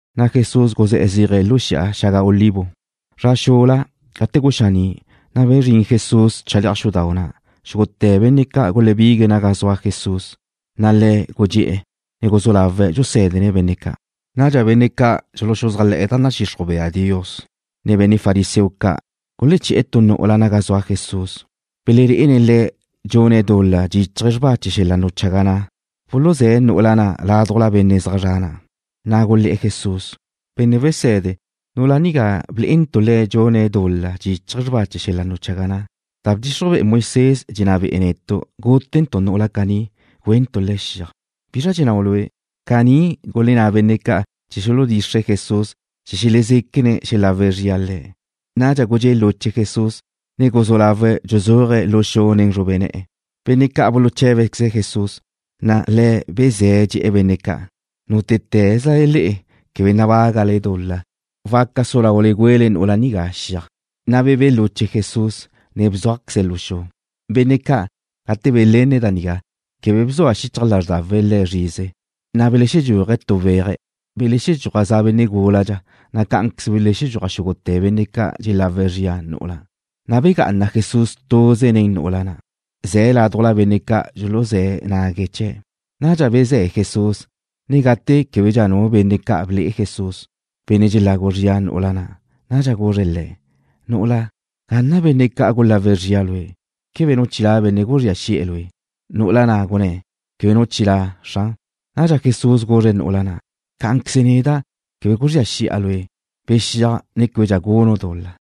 Na' Jesús guzé̱'e̱ zéaje̱' lu Xi'a Xaga Olivo. Zra xula, gate guxaní', na' bezrín Jesús chale'aj xudau' na'. Xúgute̱ benne' ca' gulebigue̱' naga zua Jesús, na' Le̱' gudxé'e̱, ne guzú lawe̱' dxusé̱dene̱' benne' ca'. Nadxa benne' ca' dxuluxuzájle̱'e̱ da nadxixruj bea Dios, ne benne' fariseo ca' guleché̱'e̱ tu nu'ula naga zua Jesús, belelé'ene̱' le̱' dxune̱' dul-la dxíchaje̱' xrba chee̱ xel-la' nuchaga na'. Buluzé̱' nu'ula na' laduj benne' zaj zre̱'e̱ na', na' gulé̱'e̱ Jesús: ―Benne' Wese̱de, nu'ula nigá blé'entu' le̱' dxune̱' dul-la dxíchaje̱' xrba chee̱ xel-la' nuchaga na'. Da bdxixruj be'e Moisés dxenná be'e netu' gútentu' nu'ula caní, güentu' le̱' xiaj. ¿Bizra dxennáu' Lue'? Caní gulenná benne' ca' chee̱ xuludxixre̱' Jesús chee̱ xelezéquene̱' xelagu zria Le̱'. Nadxa gudxé' luche Jesús, ne guzú lawe̱' dxuzúaje̱' lu xu nen zrube ne̱'e̱. Benne' ca' buluché̱bequeze̱' Jesús, na' Le̱' bezé̱' dxe̱'e̱ benne' ca': ―Nútete̱zlale le'e quebe nabágale dul-la, waca su laule güele nu'ula nigá xiaj. Na' bebé' luche Jesús, ne bzúajqueze̱' lu xu. Benne' ca', gate belenne̱' da nigá, quebe bzua xichaj lázrdawe̱' le̱' zrize, na' belexedxúaje̱' tu weaje̱'. Belexedxúaj za'a benne' gúladxa, na' ca belexedxúaj xúgute̱ benne' ca' dxelagu zrie̱' nu'ula', na' begá'ana Jesús tuze̱' nen nu'ula na', ze̱' laduj benne' ca' dxuluzé̱ nague̱' chee̱'. Nadxa bezé̱' Jesús, ne gate québedxa nu benne' ca' ble'e Jesús, benne' dxulagu zrie̱' nu'ula na', nadxa guzre̱' le̱': ―Nu'ula, ¿gazra na' benne' ca' gulagu zrie̱' lue'? ¿Quebe nu chilá' benne' guzría xi'e̱ lue'? Nu'ula na' gunné̱': ―Quebe nu chilá', Xran. Nadxa Jesús guzre̱' nu'ula na': ―Cá'anqueze neda', quebe guzría xi'a lue'. Bexíaj, ne québedxa gunu' dul-la.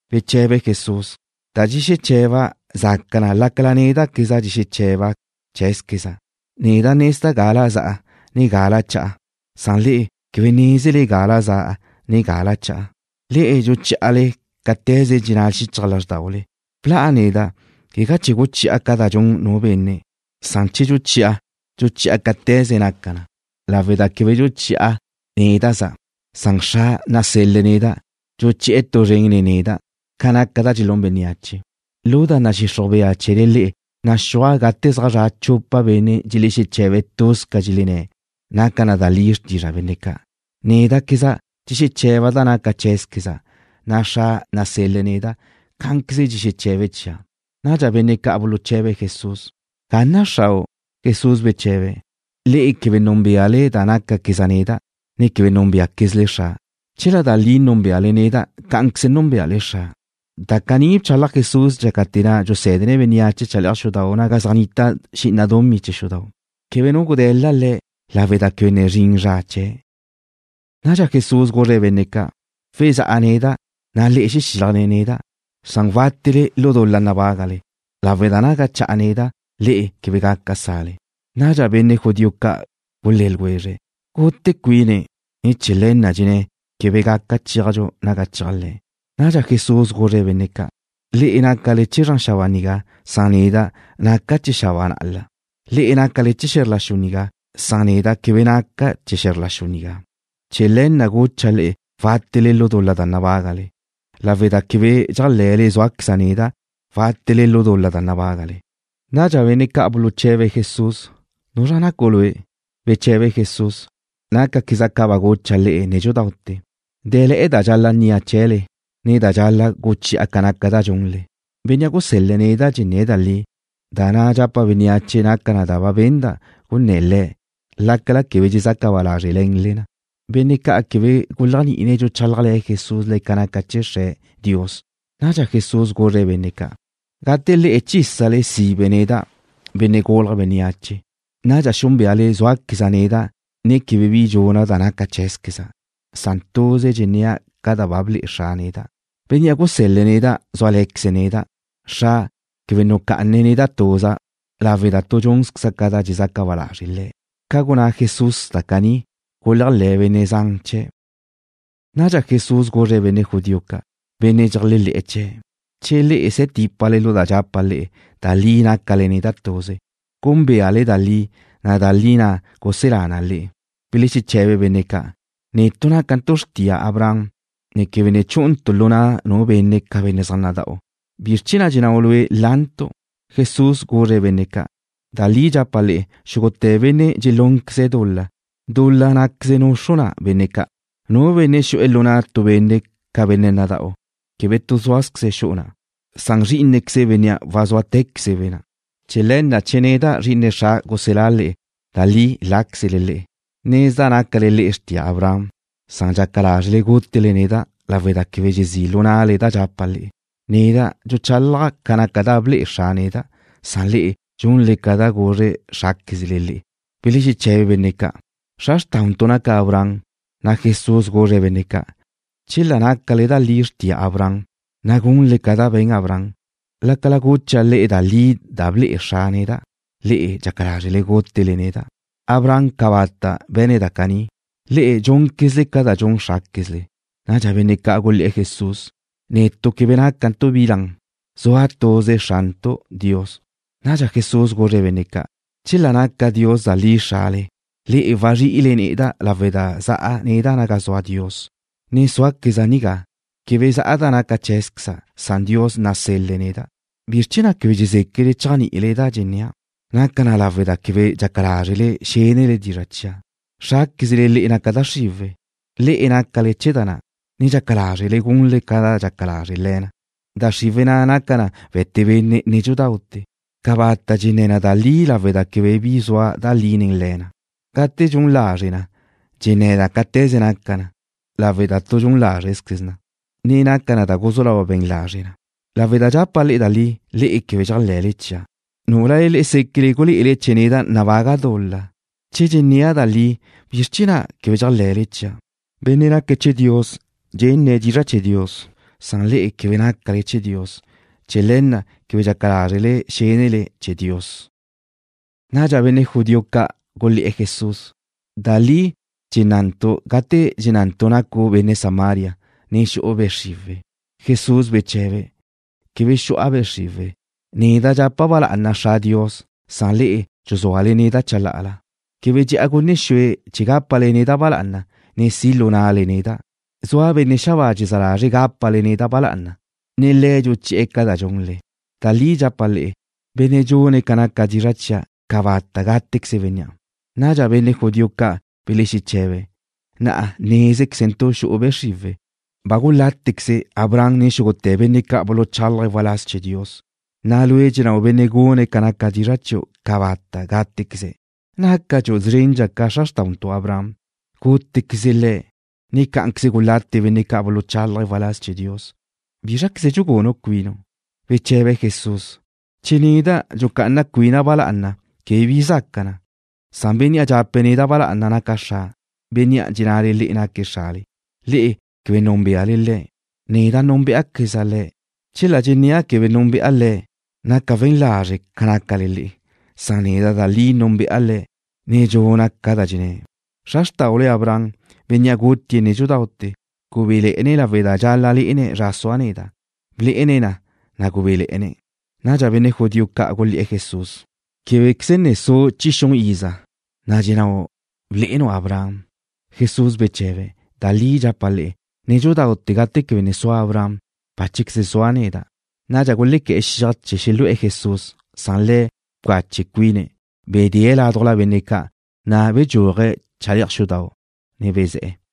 Beche̱be Jesús: ―Da dxexeche̱ba' zaca na lácala néda'queza' dxexeche̱ba' cheé̱zqueza'. Neda' nezda' gala za'a, ne gala cha'a. Le'e quebe nézele gala za'a, ne gala cha'a. Le'e dxuchí'ale cáte̱ze dxenná xichaj lázrdaule. Bla'a neda', quegá chee̱ guchi'a ca da dxun nu benne'. Che dxuchi'a, dxuchi'a cáte̱ze naca na, lawe' da quebe dxuchi'a néda'za'. Xra' nasel-le̱' neda' dxuchi'e̱ tu zren nen neda' ca naca da dxelún bénneache. Lu da nadxixruj bea chee̱le le'e naxúaj gate zaj zra' chupa benne' dxelexeche̱be̱' tuz ca dxelenné̱', naca da li xrtizra' benne' ca'. Néda'queza' dxexeche̱ba' da naca cheé̱zqueza', na' Xra' nasel-le̱' neda', cá'anqueze dxexeche̱be̱' chia'. Nadxa benne' ca' buluche̱be̱' Jesús: ―¿Ga na' Xrau'? Jesús beche̱be̱': ―Le'e quebe núnbeale da nácaqueza' neda', ne quebe núnbeaquezle Xra'. Chela da li núnbeale neda', cá'anqueze núnbeale Xra'. Da caní bchalaj Jesús dxácate̱ na' dxusé̱dene̱' bénneache chale'aj xudau' naga zaj nnita xi'ina dumí chee̱ xudau'. Quebe nu gude̱la Le̱' lawe' da quebe ne zrin zra chee̱'. Nadxa Jesús guzre̱' benne' ca': ―Wexá'a neda', na' le'e xexílajle neda', na' wátele lu dul-la nabágale, lawe' da naga cha'a neda', le'e quebe gaca sa'le. Nadxa benne' judío ca' gulé̱ ljwezre̱': ―¿Gute cuine̱', ne chee̱ le̱ na' dxenné̱' quebe gaca chéajdxu naga cheaj Le̱'? Nadxa Jesús guzre̱' benne' ca': ―Le'e nácale chee̱ zran xabáa nigá. Neda' naca' chee̱ xabáa na'la. Le'e nácale chee̱ xe̱zr la xu nigá. Neda' quebe naca' chee̱ xe̱zr la xu nigá. Chee̱ le̱ na' gucha' le'e wátele lu dul-la nabágale, lawe' da che quebe dxéajle̱le zúaqueza' neda', wátele lu dul-la nabágale. Nadxa benne' ca' buluche̱be̱' Jesús: ―¿Nuzra nacu' Lue'? Beche̱be Jesús: ―Nácaqueza' ca ba gucha' le'e nédxudaute̱. Dé̱le̱'e̱ da dxal-la' nnia' chee̱le, ne da dxal-la' guchi'a ca naca da dxunle. Bénnea' gusél-le̱' neda' dxenné̱' da li, na' da dxapa' bénneache naca na da ba benda' gunné̱ Le̱', lácala quebe dxezaca ba lázrele̱nle na. Benne' ca' quebe guléajni'ine̱' dxuchálajle̱ Jesús le̱' ca naca chee̱ Dios, Xre̱'. Nadxa Jesús guzre̱' benne' ca': ―Gate le'e chísale sibe neda', Benne' Gulje̱' Bénneache, nadxa xúnbeale zúaqueza' neda', ne quebe bi dxuna' da naca cheé̱zqueza'. Tuze dxennéa' ca da ba ble'e Xra' neda'. Bénnea' gusél-le̱' neda' zúale̱queze̱' neda'. Xra' quebe nucá'ane̱' neda' tuza' lawe' da tu dxúnzqueza' ca da dxezaca ba lazre' Le̱'. Ca gunná Jesús da caní, guléajle̱ benne' zan chee̱'. Nadxa Jesús guzre̱' benne' judío ca', benne' dxeléajle̱'e̱ chee̱': ―Che le'e se̱ típale lu da dxapa' le'e, da li nácale neda' tuze. Gúnbeale da li, na' da li na' guselá na le'e. Belexeche̱be benne' zan ca': ―Netu' nácantu' xrtia Abraham, ne quebe ne chú'untu' lu na' nu benne' ca benne' zaj nada'u. ¿Bizr chee̱ na' dxennáu' Lue' lantu'? Jesús guzre̱' benne' ca': ―Da li dxapa' le'e, xúgute̱ benne' dxelúnqueze̱' dul-la, dúl-laqueze na' nuxru na benne' ca'. Nu benne' xu'e̱ lu na' tu benne' ca benne' nada'u quebe tu súazqueze̱' xu'u na'. Zrí'inequeze bénnea' wazúatequezebe'. Chee̱ le̱ na', che neda', Zri'ine Xra', guselá' le'e, da li láquezle le'e. Nezda' nácale le'e xrtia Abraham. Na'a dxaca lázrele gútele neda' lawe' da quebe dxezí' lu na'le da dxapa' le'e. Neda' dxuchálaja' ca naca da ble'e Xra' neda', na' le'e dxunle ca da guzre xráquezle le'e. Belexeche̱be benne' ca': ―Xra xrtauntu' naca Abraham. Na' Jesús guzre̱' benne' ca': ―Chela nácale da li xrtia Abraham, na' gunle ca da be̱n Abraham. Lácala gucha' le'e da li da ble'e Xra' neda', le'e dxaca lázrele gútele neda'. Abraham cabata' be̱ne̱' da caní. Le'e dxúnquezle ca da dxun xráquezle. Nadxa benne' ca' gulé̱'e̱ Jesús: ―Netu' quebe nácantu' bi lan. Zua tuze Xrantu', Dios. Nadxa Jesús guzre̱' benne' ca': ―Chela naca Dios da li Xrale, le'e wazrí'ile neda' lawe' da za'a neda' naga zua Dios, ne zúaqueza' nigá. Quebe za'a da naca cheé̱zqueza'. Dios nasel-le̱' neda'. ¿Bizr chee̱ na' quebe dxezéquele chéajni'ile da dxennéa'? Naca na lawe' da quebe dxaca lázrele xénele dizra' chia'. Xráquezle le'e naca da xriwe̱'. Le'e nácale chee̱ da na', ne dxaca lázrele gunle ca da dxaca lazre' le̱ na. Da xriwe̱' na' naca na we̱te benne' nédxudaute̱. Cabata' dxenné̱ na da li lawe' da quebe bi zua da li nen le̱ na. Gate dxun lazre' na, dxenné̱ na cáte̱ze naca na, lawe' da tu dxun lázrezqueze na, ne naca na da guzú lau na be̱n lazre' na. Lácala dxapa' le'e da li, le'e quebe dxéajle̱le chia'. ¿Núlale le'e séquele gulé'ele nabaga neda' tu dul-la? Che dxennéa' da li, ¿bizr chee̱ na' quebe dxéajle̱le chia'? Benne' naque̱' chee̱ Dios dxenne̱' dizra' chee̱ Dios. Le'e quebe nácale chee̱ Dios. Chee̱ le̱ na' quebe dxaca lázrele xénele chee̱ Dios. Nadxa benne' judío ca' gulé̱'e̱ Jesús: ―Da li dxennantu' gate dxennantu' nacu' benne' Samaria, ne xu'u be' xriwe̱'. Jesús beche̱be̱': ―Quebe xu'a be' xriwe̱'. Neda' dxapa' ba lá'ana Xra' Dios, na' le'e dxuzúale neda' chalá'ala. Quebe dxe'a gunne xue chee̱ gápale neda' ba lá'ana, ne si' lu na'le neda'. Zua Benne' xabáa dxezá lazre̱' gápale neda' ba lá'ana, ne Le̱' dxuchi'e̱ ca da dxunle. Da li dxapa' le'e: Benne' dxune̱' ca naca dizra' chia', cabata' gátequeze bénnea'. Nadxa benne' judío ca' belexeche̱be̱': ―Na'a nézquezentu' xu'u be' xriwe̱'. Ba gulátequeze Abraham, ne xúgute̱ benne' ca' buluchálaje̱' waláz chee̱ Dios, na' lue' dxennáu' benne' gune̱' ca naca dizra' chiu' cabata' gátequeze̱'. ¿Nácadxu' szrendxa ca xra xrtáudxu Abraham? Gútequeze Le̱', ne cá'anqueze gulate benne' ca' buluchálaje̱' waláz chee̱ Dios. ¿Bízraqueze dxugune cuinu'? Beche̱be Jesús: ―Che neda' dxucá'ana cuina' ba lá'ana, quebe bi zaca na. Benne' dxape̱' neda' ba lá'ana naque̱' Xra', Bénnea' dxennale le'e naque̱' Xrale. Le'e quebe núnbeale Le̱'. Neda' núnbeaqueza' Le̱'. Chela dxennéa' quebe núnbe'a Le̱', naca' we̱n lazre' ca nácale le'e. Neda' da li núnbe'a Le̱', ne dxuna' ca da dxenné̱'. Xra xrtáule Abraham, bénnea' gutie̱' nédxudaute̱, gubéle̱'e̱ne̱' lawe' da dxal-la' lé'ene̱' zra zua neda'. Blé'ene̱' na, na' gubéle̱'e̱ne̱'. Nadxa benne' judío ca' gulé̱'e̱ Jesús: ―Québequeze ne su' chi xun iza, na' ¿dxennáu' blé'enu' Abraham? Jesús beche̱be̱': ―Da li dxapa' le'e, nédxudaute̱ gate quebe ne sua Abraham, báchequeze zua' neda'. Nadxa gulequé̱'e̱ xiaj chee̱ xelu'e̱ Jesús, na' Le̱' bcache cuine̱'. Bdee̱' ládujla benne' ca', na' bedxúaje̱' chale'aj xudau', ne bezé̱'e̱.